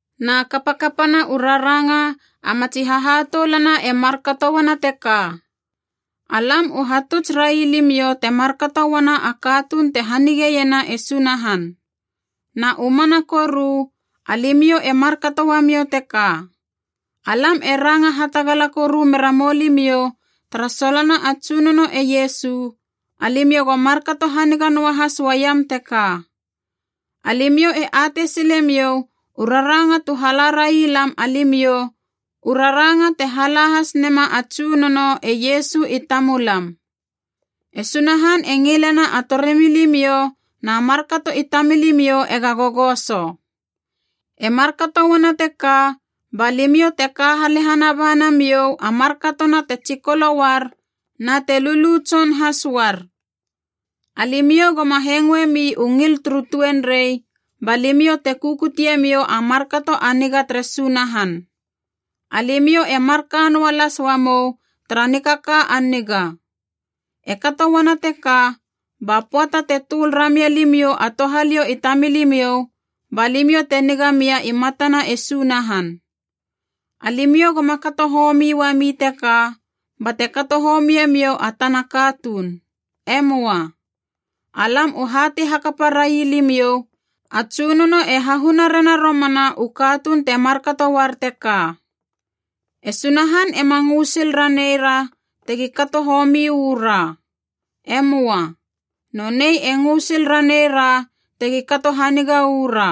Na kapakapana u raranga a matsi hahatoulana e markato uana teka, alam u hatuts railimiou te markato uana a katuun te hanigeiena e Sunahan. Na u mana koru, alimiou e markato uamiou teka. Alam e ranga hatagala koru mera moulimiou tara solona a Tsunono e Iesu, alimiou go markato haniga noahas uaiam teka. Alimiou e atei silemiou u raranga tu hala railam alimiou, u raranga te hala has nema a Tsunono e Iesu i tamulam. E Sunahan e ngilena a torimilimiou na markato i tamilimiou ega gogoso. E markato uana teka ba limiou te ka halehana ba namiou a markatona te tsikolo uar na te lulu tson has uar. Alimiou goma hengoemi u ngil turu tuenrei, ba limiou te kukute miou a markato a niga tere Sunahan. Alimiou e marka noa las uamou tara nikaka a niga. E kato uana teka ba pöata te töl ramia limiou a touhaliou i tamilimiou ba limiou te niga mia i matana e Sunahan. Alimiou goma kato homi uami teka bate kato homie miou a tana katuun. E möa. Alam u hatei hakapa railimiou, a Tsunono e hahuna rena romana u katuun te markato uar teka. E Sunahan ema ngö sil ranei ra tegi kato homi uu ra. E möa. Nonei e ngö sil ranei ra tegi kato haniga uu ra.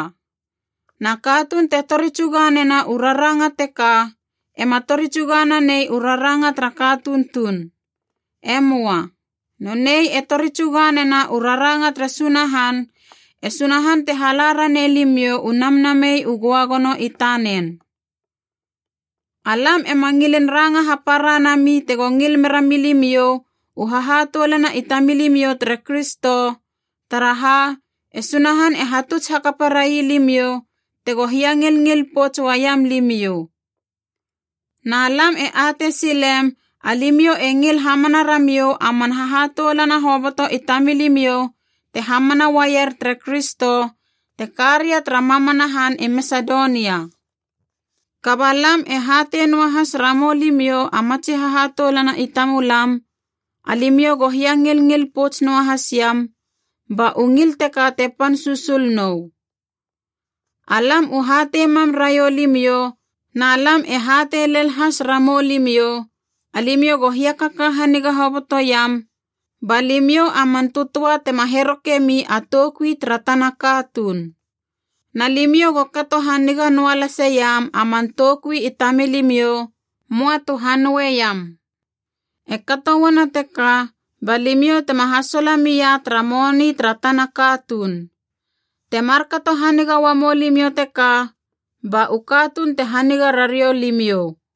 Na katuun te tori tsuga nena u raranga teka ema tori tsuga nanei u raranga tara katuun tuun. E möa. Nonei e tori tsuga nena u raranga tere Sunahan, e Sunahan te hala ranei limiou u Namnamei u Göagono i tanen. Alam ema ngilin ranga hapara nami tego ngil mera milimiou u hahatoulana i tamilimiou tere Kristo, taraha e Sunahan e hatuts hakapa railimiou tego hiangilngil pouts uaiam limiou. Na lam e atei silem alimiou e ngil hamana ramiou a man hahatoulana hoboto i tamilimiou te hamana uaier tere Kristo te ka ria tara mamana han i Masedonia. Kaba lam e hatei noahas ramou limiou a matsi hahatoulana i tamulam, alimiou go hiangilngil pouts noahasiam, ba u ngil teka te pan susul nou. Alam u hatei mam raiou limiou na lam e hatei lel has ramou limiou, alimiou go hiakaka haniga hobotoiam ba limiou a man tötöa tema herokemi a toukui tara tana katuun. Na limiou go kato haniga noa laseiam a man toukui i tamilimiou, möa tu hanoeiam. E kato uana teka ba limiou tema hasola mia tara moni tara tana katuun. Te markato haniga uamou limiou teka, ba u katuun te haniga rariou limiou.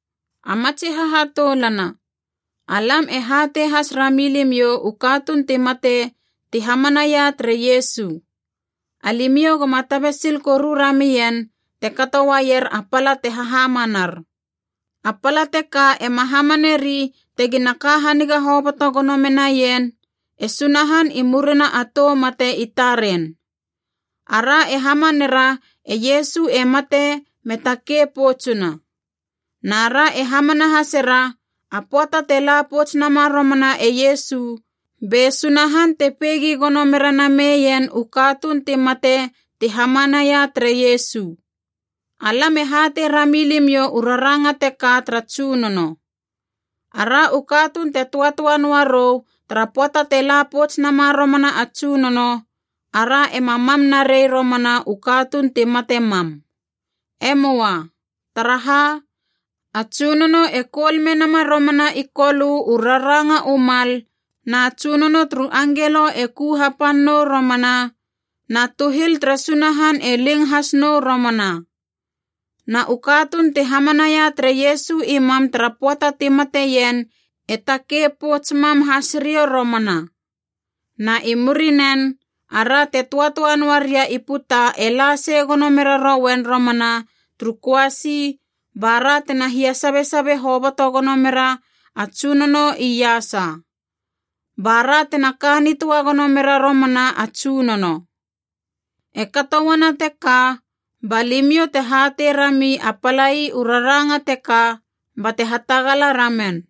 A matsi hahatoulana, alam e hatei has rami limiou u katuun ti mate ti hamanaia tere Iesu. Alimiou goma tabe sil koru ramien te kato uaier a pala te hahamanar. A pala teka ema hamaneri tegina ka haniga hoboto gono menaien e Sunahan i murina a tou mate i taren. Ara e hamanera e Iesu e mate me takei poutsuna. Na ra e hamana hasera, a pöata te la pouts nama romana e Iesu be Sunahan te peigi gono mera nameien u katuun ti mate ti hamanaia tere Iesu. Alam e hatei rami limiou u raranga teka tara Tsunono: ara u katuun te töatöa noa rou tara pöata te la pouts nama romana a Tsunono, ara ema mam narei romana u katuun ti mate mam. E möa. Taraha, a Tsunono e koul menama romana i Kolö u raranga u mal, na tsunono turu angelo e ku hapan nou romana, na tuhil tere Sunahan e ling has nou romana. Na u katuun ti hamanaia tere Iesu i mam tara pöata ti mateien e takei pouts mam has riou romana. Na i murinen, ara te töatöa noa ria i puta e la sei gono mera rouen romana turu köasi, ba ra tena hia sabe sabe hoboto gono mera a Tsunono iasa. Ba ra tena ka nitöa gono mera romana a Tsunono. E kato uana teka, ba limiou te hatei rami a palai u raranga teka bate hatagala ramen.